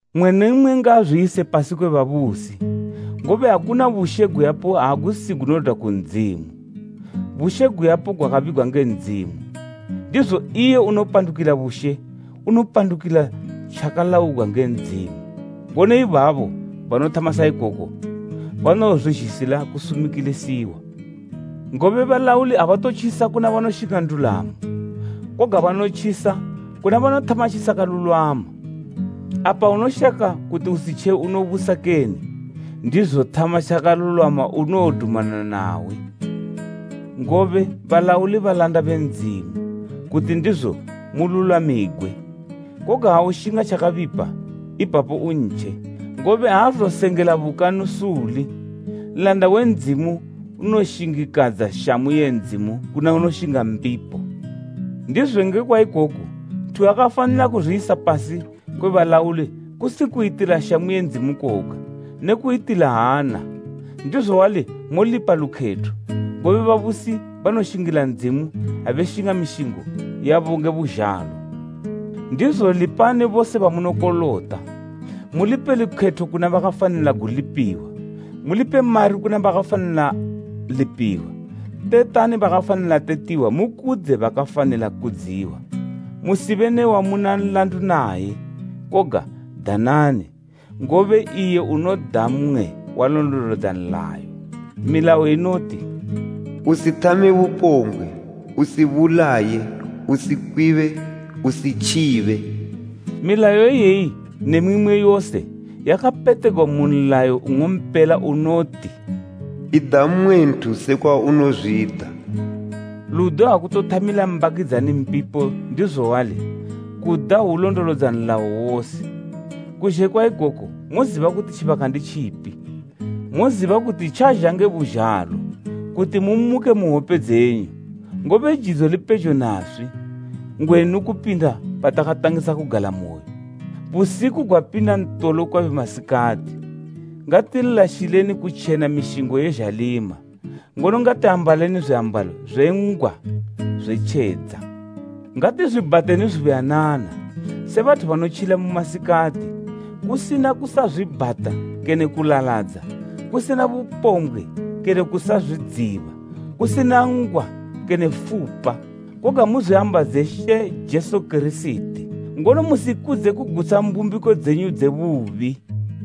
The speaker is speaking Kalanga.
Mmwe ne mmwe ngaazwiyise pasi kwe babusi, ngobe akuna bushe guyapo agusi gunodwa ku Ndzimu, bushe guyapo gwakabigwa nge Ndzimu. Ndizo iye unopandukila bushe gopandukila tjakalaugwa nge Ndzimu, ngono ibabo banothama sa ikoko banowozwizhisila kusumikilisiwa. Ngobe balauli abatotjisa kuna banoshinga ndulamo, koga banotjisa kuna banothama tjisakalulwama. Apa unoshaka kuti usitje unobusa kene? Ndizo thama tjakalulwama unowodumana nawe, ngobe balauli balanda be Ndzimu, kuti ndizo mululwamigwe. Koga ha ushinga tjakabipa, ipapo untje, ngobe aazosengela bukanu suli. Nlanda we Ndzimu unoshingikadza shamu ye Ndzimu kuna unoshinga mbipo. Ndizo ngekwa ikoku nthu wakafanila kuzwiyisa pasi kwe balauli kusi kuyitila shamu ye Ndzimu koga, ne kuyitila hana. Ndizo wali molipa lukhetho, ngobe babusi banoshingila Ndzimu abe shinga mishingo yabo nge buzhalo. Ndizo lipani bose bamunokolota, mulipe lukhetho kuna bakafanila gulipiwa, mulipe mari kuna bakafanila lipiwa, tetani bakafanila tetiwa mukudze bakafanila kudziwa. Musibe ne wamuna nlandu naye, koga danani, ngobe iye unoda mmwe walondolodza nlayo. Milayo inoti, “Usithame bupombgwe, usibulaye, usikwibe, usitjibe.” Milayo iyeyi ne mimwe yose, yakapetegwa mu nlayo nng'ompela unoti, “Ida mmwe nthu sekwa unozwida.” Ludo agutothamila mbakidzani mbipo ndizo wali, kuda hwulondolodza nlayo wose. Kuzhe kwa ikoku moziba kuti tjibaka ndi tjipi, moziba kuti tjazha nge buzhalo kuti mumuke mu hwope dzenyu, ngobe jidzo lipejo naswi ngwenu kupinda patakatangisa kugalamoyo. Busiku gwapinda ntolo kwabe masikati. Ngatilashileni kutjena mishingo ye zhalima, ngono ngatiambaleni zwiambalo zwe ngwa zwe tjedza. Ngatizwibhateni zubuyanana se bathu banotjila mu masikati, kusina kusazwibhata kene kulaladza, kusina bupombgwe kene kusazwidziba, kusina ngwa kene fupa. Koga muzwiambadze She Jesu Kirisiti, ngono musikudze kugutsha mbumbiko dzenyu dze bubi.